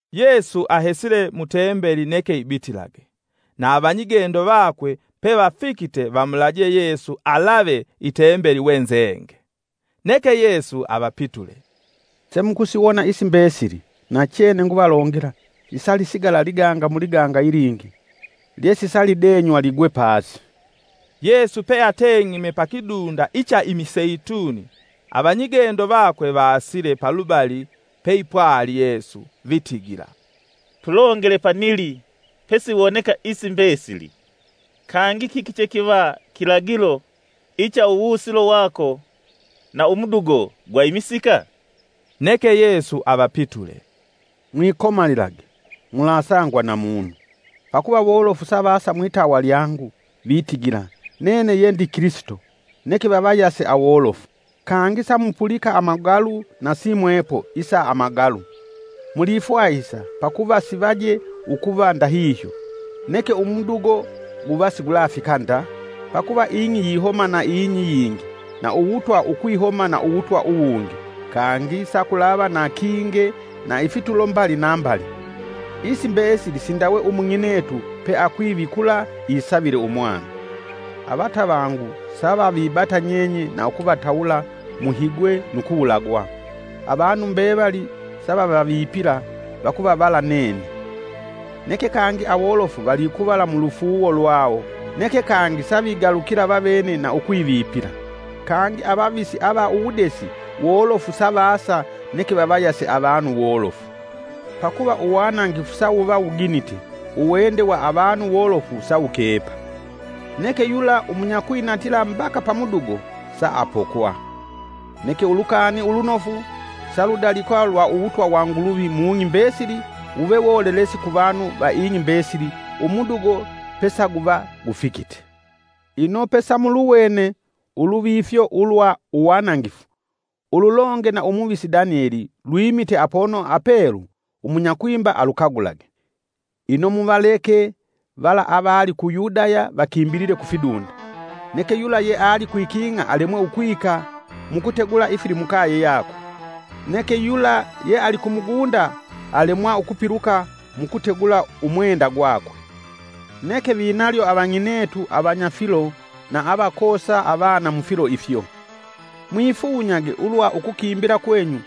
Yesu ahesile mutembeli neke ibitilage, na avanyigendo vakwe pevafikite vamulaje Yesu alave Itembeli we nzenge. Neke Yesu avapitule, “Semukusiwona isi mbesili! Nachene nguvalongela sisalisigala liganga muliganga ilingi, lyesisalidenywa ligwe pasi.” Yesu peateng'ime pakidunda icha imiseituni, avanyigendo vakwe vaasile palubali peipwali Yesu vitigila, “Tulongele panili pesiwoneka isi mbesili, kangi kiki chekiva kilagilo icha uwusilo wako na umudugo gwa imisika?” Neke Yesu avapitule, “Mwikomalilage, mulasangwa na munu. Pakuva wolofu savasa mwitawa lyangu, itigila: ‘Nene yendi Kilisito,’ neke vavayase awolofu. Kangi samupulika amagalu na simwepo isa amagalu; mulifwahisa pakuva sivaje ukuva ndahihyo, neke umudugo guva sigulafika nda. Pakuva ing'i yihoma na ing'i iyingi na uwutwa ukwihoma na uwutwa uwungi, kangi sakulava na kinge na ifitulo mbali na mbali. Isi mbesili sindawe umung'inetu pe akwivikula isavile umwana. “Avatavangu sa vavibata nyenye na ukuvatawula muhigwe nu kuwulagwa. Avanu mbevali savavavipila vakuvavala nene. Neke kangi awolofu valikuvala mulufuuwo lwawo neke kangi savigalukila vavene na ukwivipila. Kangi avavisi ava uwudesi wolofu savasa neke vavayase avanu wolofu. Pakuva uwanangifu sawuva wuginite, uwende wa avanu wolofu sawukepa. Neke yula umunyakwinatila mbaka pamudugo saapokwa. Neke Ulukani Ulunofu saludalikwa lwa uwutwa wa Nguluvi mung'i mbesili wuve wolelesi ku vanu va ing'i mbesili umudugo pesaguva gufikite. “Ino pesamuluwene ‘Uluvifyo ulwa Uwanangifu,’ ululonge na umuvisi Danyeli, lwimite apono apelu (umunya kwimba alukagulage). Ino muvaleke vala avali ku Yudaya vakimbilile kufidunda. Neke yula yealikwiking'a alemwa ukwika mukutegula ifilimukaye yakwe. Neke yula yeali kumugunda alemwa ukupiluka mukutegula umwenda gwakwe. Neke vinalyo avang'inetu avanya filo na avakoosa avana mufilo ifyo. Mwifunyage ulwa ukukimbila kwenyu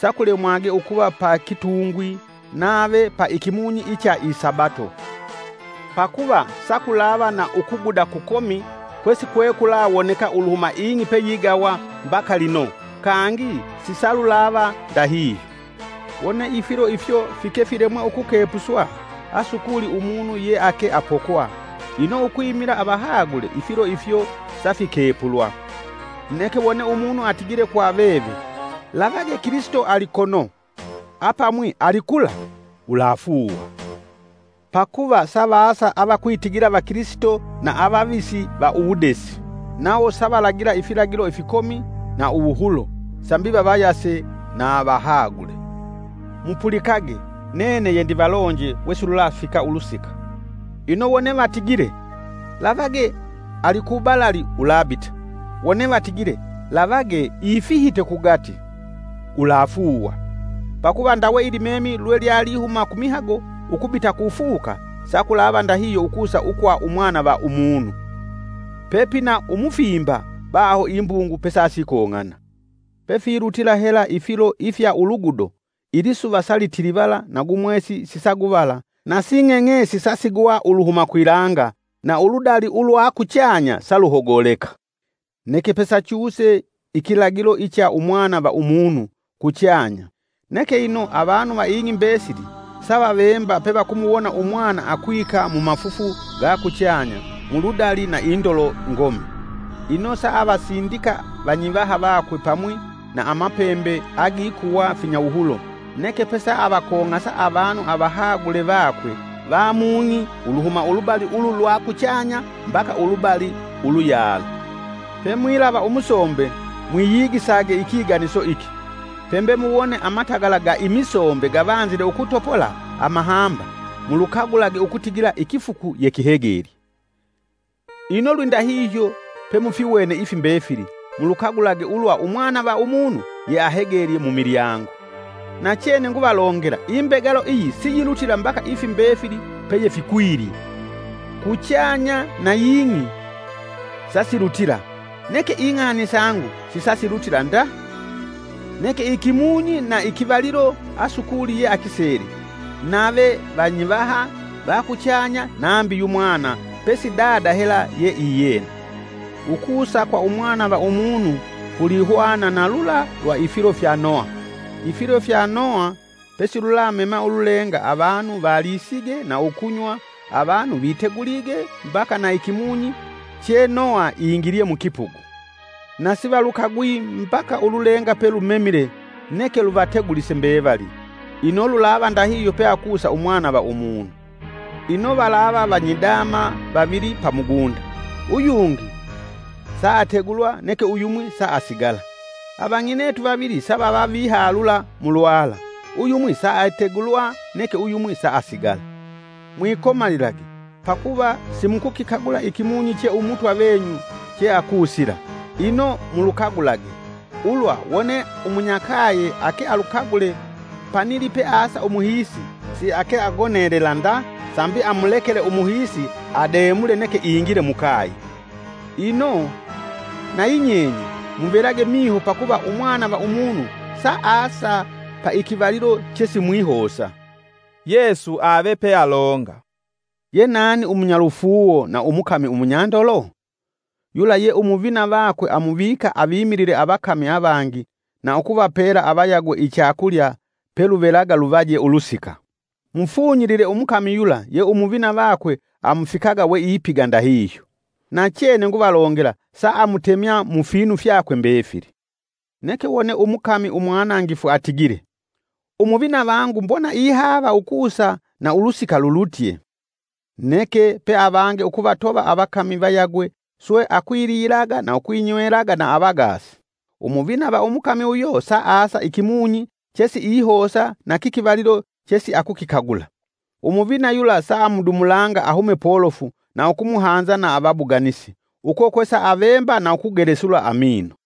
sakulemwage ukuva pa kitungwi nave pa ikimunyi icha isabato! Pakuva sakulava na ukuguda kukomi kwe sikwekulawoneka uluhuma ing'i peyigawa mbaka lino, kangi sisalulava ndahihyo. Wone ifilo ifyo fike filemwe ukukepuswa asukuli umunu yeake apokwa, ino ukwimila avahagule ifilo ifyo safikepulwa. “Neke wone umunu atigile kwa veve: ‘Lavage Kilisito alikono’ apamwi ‘Alikula’ ulafuuwa. Pakuva savaasa avakilisito va uwudesi, nawo savalagila ifilagilo ifikomi na uwuhulo, sambi vavayase na vahagule. Mupulikage, nene yendivalonje we silulafika ulusika. Ino wone vatigile, ‘Lavage alikubalali ulabita,’ wone vatigile, ‘Lavage, ifihite kugati’ ulafuuwa. Pakuva ndawe ilimemi lwe lya lihuma kumihago ukubita kufuka, sakulava ndahihyo ukusa ukwa Umwana va Umunu. Pepina umufimba baho imbungu pesasikong'ana. “Pefilutila hela ifilo ifya ulugudo, salitilivala na gu mwesi sisaguvala na sing'eng'esi sasigwa uluhuma kwilanga na uludali ulwa kuchanya saluhogoleka. Neke pesachuse ikilagilo icha Umwana va Umunu kuchanya, neke ino avanu va ing'i mbesili savavemba pevakumuwona Umwana akwika mumafufu ga kuchanya mu ludali na indolo ngomi. Ino saavasindika vanyivaha vakwe pamwi na amapembe agikuwa finyawuhulo neke pesavakong'asa avanu avahagule vakwe va mung'i uluhuma ulubali ulu lwa kuchanya mbaka ulubali uluyalo. “Pemwilava Umusombe mwiyigisage ikiganiso iki: Pembe muwone amatagala ga imisombe gavanzile ukutopola amahamba mulukagulage ukutigila ikifuku yekihegelye. Ino lwindahihyo, pemufiwene ifi mbefili mulukagulage ulwa Umwana va Umunu yeahegelye mumilyango. Nachene nguvalongela, imbegalo iyi siyilutila mbaka ifi mbefili peyefikwilye. Kuchanya na ying'i sasilutila, neke ing'ani sangu sisasilutila nda. “Neke ikimunyi na kivalilo asukuli ye akisele; nave vanyivaha va kuchanya nambi Yumwana pesi Dada hela ye iyena. Ukusa kwa Umwana va Umunu kulihwana na lula lwa ifilo fya Noha. Ifilo fya Noha pesilulamema ululenga avanu valisige na ukunywa avanu vitegulige mbaka na ikimunyi che Noha ingilye mukipugu. Na sivalukagwi mbaka ululenga pelumemile neke luvategulise mbevali, ino lulava ndahihyo peakusa Umwana va Umunu. Ino valava vanyidama vavili pa mugunda; uyungi saategulwa neke uyumwi saasigala. Avang'inetu vavili savava vihalula mulwala, uyumwi saategulwa neke uyumwi saasigala. Mwikomalilage, pakuva simukukikagula ikimunyi che Umutwa venyu cheakusila. Ino mulukagulage, ulwa wone umunyakaye akealukagule panili peasa umuhiisi, siake agonelela nda sambi amulekele umuhiisi ademule neke ingile mukaye. Ino nayi nyenye muvelage miho pakuva Umwana va Umunu saasa paikivalilo chesimwihosa.” Yesu avepealonga “Ye nani umunyalufuuwo na umukami Umunyandolo? Yula ye umuvina vakwe amuvika avimilile avakami avangi na ukuvapela avayagwe ichakulya peluvelaga luvaje ulusika. Mufunyilile umukami yula ye umuvina vakwe amufikaga weipiga ndahihyo. Nachene nguvalongela saamutemya mufinu fyakwe mbefili. Neke wone umukami umwanangifu atigile: ‘Umuvina vangu mbona ihaava ukusa na ulusika lulutye,’ Neke peavange ukuvatova avakami vayagwe swe akwililaga na ukwinywelaga na avagaasi, umuvina va umukami uyo saasa ikimunyi che siihosa na kikivalilo chesiakukikagula. Umuvina yula saamudumulanga ahume polofu na ukumuhanza na avabuganisi. Uko kwe saavemba na ukugelesula amino.